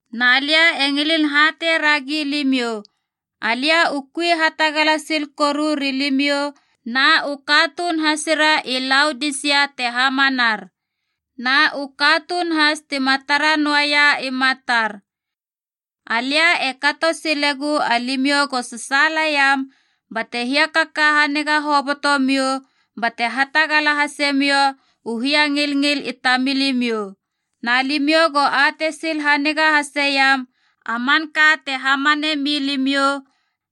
Na lia e ngilin hatei ragi limiou, alia u kui hatagala sil koru rilimiou na u katuun hasira i Laodisia te hamanar, na u katuun has tima tara noaia i matar. Alia e kato silegu alimiou go sasaalaiam bate hiakaka haniga hoboto miou bate hatagala hase miou u hiangilngil i tamilimiou. Na limiou go atei sil haniga haseiam a manka te hamane milimiou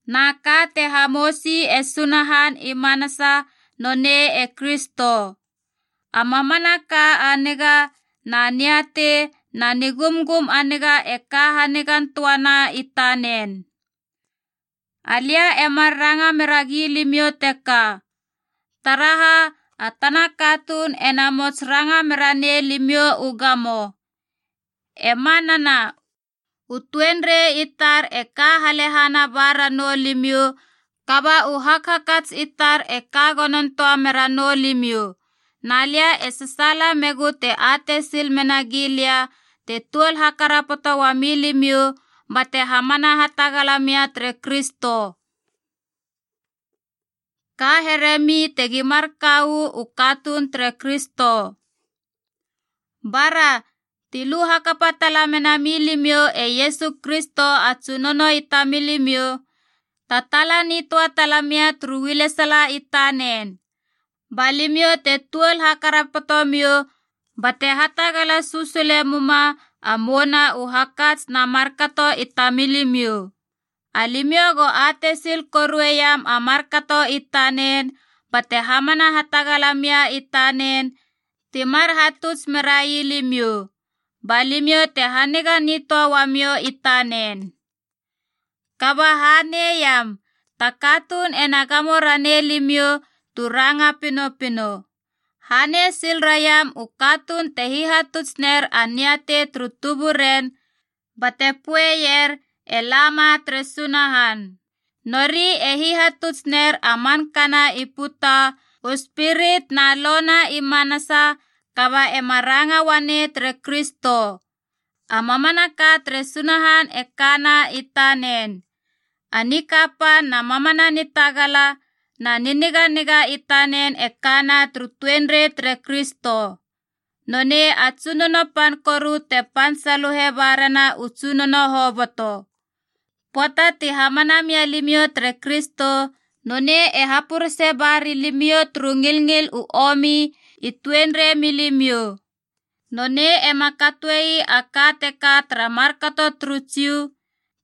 na ka te hamousi e Sunahan i manasa, nonei e Kristo. A mamanaka a niga na niatei na nigumgum a niga e ka hanigan töana i tanen. Alia e mar ranga mera gilimiou teka, taraha a tana katuun e namots ranga mera nei limiou u gamo. E manana, u tuenrei i tar e ka halehana ba ranou limiou, kaba u hakhakats i tar e ka gonon töa mera noulimiou. Na lia e sasaala megu te atei sil mena gilia te tuol hakarapoto uami limiou bate hamana hatagala mia tere Kristo. Ka here mi tegi mar ka uu katuun tere Kristo. Bara, ti lu hakapa tala mena milimiou e Iesu Kristo a Tsunono i tamilimiou, tataala nitöa talamia turu ualesala i tanen. Ba limiou te tuol hakarapoto miou bate hatagala susule muma a mouna u hakats na markato i tamilimiou. Alimiou go atei sil korueiam a markato i tanen bate hamana hatagala mia i tanen, ti mar hatuts merai limiou. Ba limiou te haniga nitöa uamiou i tanen. Kaba haneiam, ta katuun ena gamo ranei limiou tu ranga pinopino. Hanei sil raiam u katuun te hihatuts ner a niatei turu tuburen bate poeier e lama tere Sunahan. Nori e hihatuts ner a mankana i puta, u spirit na lo na i manasa, kaba ema ranga uanei tere Kristo. A mamanaka tere Sunahan e kana i tanen, a nikapan na mamana nitagala na niniganiga i tanen e kana turu tuenrei tere Kristo. Nonei a tsunono pan koru te pan saluhe ba rena u tsunono hoboto. Pöata ti hamana mia limiou tere Kristo, nonei e hapurese ba ria limiou turu ngilngil u omi i tuenrei milimiou. Nonei ema katoe ii a ka teka tara markato turu Jiu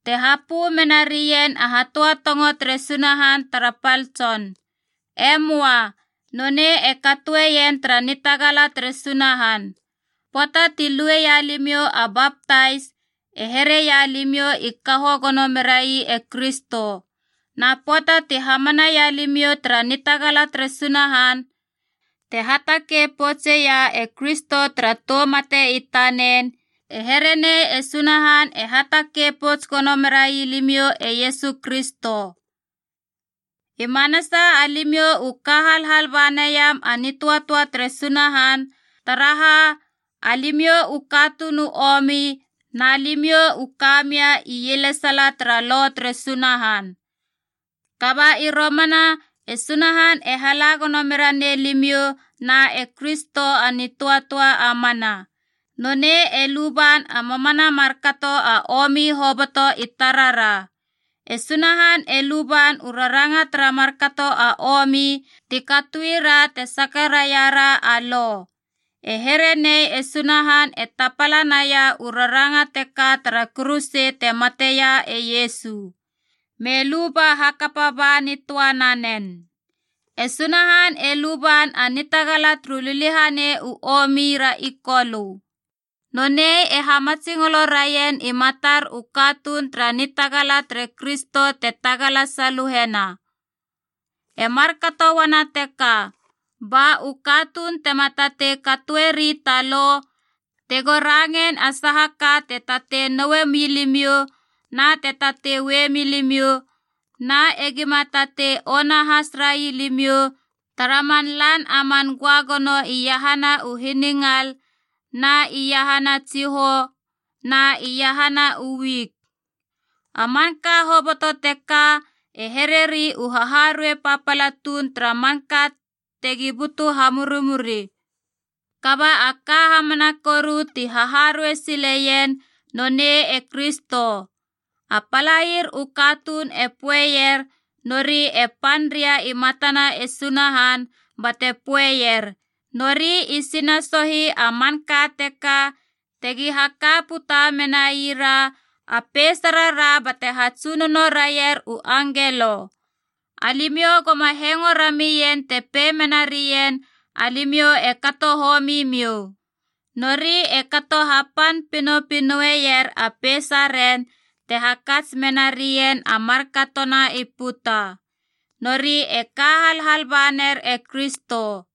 te hapö mena rien a hatöatongo tere Sunahan tara pal tson. E möa. Nonei e katoeien tara nitagala tere Sunahan. Pöata ti lueia limiou a baptais, e here ii alimiou i kaho gono merai e Kristo. Na pöata tu hamanaia limiou tara nitagala tere Sunahan, te hatakei poutseia e Kristo tara tou mate i tanen, e here nei e Sunahan e hatakei pouts gono merai limiou e Iesu Kristo. I manasa alimiou u ka halhal ba naiam a nitöatöa tere Sunahan, taraha alimiou u katuun u omi na limiou u ka mia ielesala tara Lo tere Sunahan. Kaba i romana e Sunahan e hala gono me ranei limiou na e Kristo a nitöatöa a mana. Nonei e luban a mamana markato a omi hoboto i tarara. E Sunahan e luban u raranga tara markato a omi ti katoira te saka raira a Lo. E here nei e Sunahan e tapala naia u raranga teka tara kuruse te mateia e Iesu. Me luba hakapaba nitöa nanen. E Sunahan e luban a nitagala turu liliahanei u omi ra i kolö. Nonei e hamatsingolo raien i matar u katuun tara nitagala tere Kristo te tagala saluhena. E markato uana teka ba u katuun tema tatei katoeri ta lo tego rangein a saha ka te tatei noue milimiou na te tatei ue milimiou, na egima tatei ona has rai limiou tara man lan a man göagono iahana u hiningal na iahana tsihou na iahana u wik. A manka hoboto teka e hereri u haharuei papala tuun tara manka tegi butu hamurimuri. Kaba a ka hamana koru ti haharuei sileien, nonei e Kristo. A palair u katuun e poeier nori e pan ria i matana e Sunahan bate poeier, nori i sinasohi a manka teka tegi haka puta menaira a peisarara bate hatsunono raier u angelo. Alimiou goma hengo ramien te pei mena rien alimiou e kato homimiou. Nori e kato hapan pinopinoer a peisaren te hakats mena rien a markatona i puta. Nori e ka halhal baner e Kristo.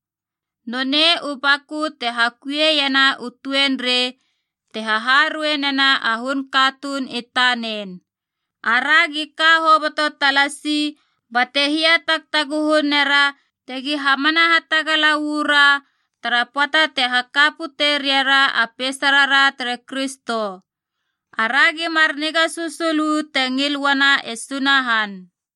Nonei u baku te hakuiena u tuenrei, te haharuei nena a hun katuun i tanen. Aragi ka hoboto talasi bate hiatagtaguhu nera tegi hamana hatagala uu ra tara pöata te haka pute ria ra a peisarara tere Kristo. Aragi mar niga susul uu te ngil uana e Sunahan.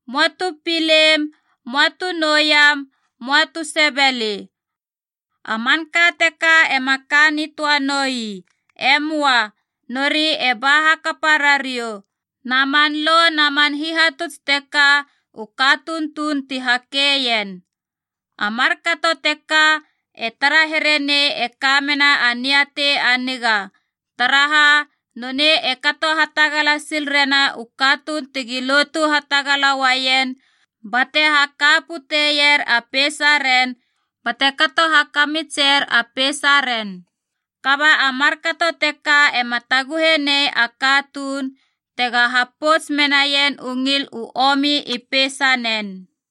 “Möa tu pilein, möa tu noueiam, möa tu sebeli.” A manka teka ema ka nitöa noi. E möa. Nori e ba hakapa rariou. Na man lo na man hihatuts teka, u katuun tuun ti hakeien. A markato teka e tara here nei e kamena a niatei a niga, taraha nonei e kato hatagala sil rena u katuun tegi lotu hatagala uaien bate haka puteier a peisaren bate kato hakamitser a peisaren. Kaba a markato teka ema taguhe nei a katuun tega hapouts menaien u ngil u omi i peisanen.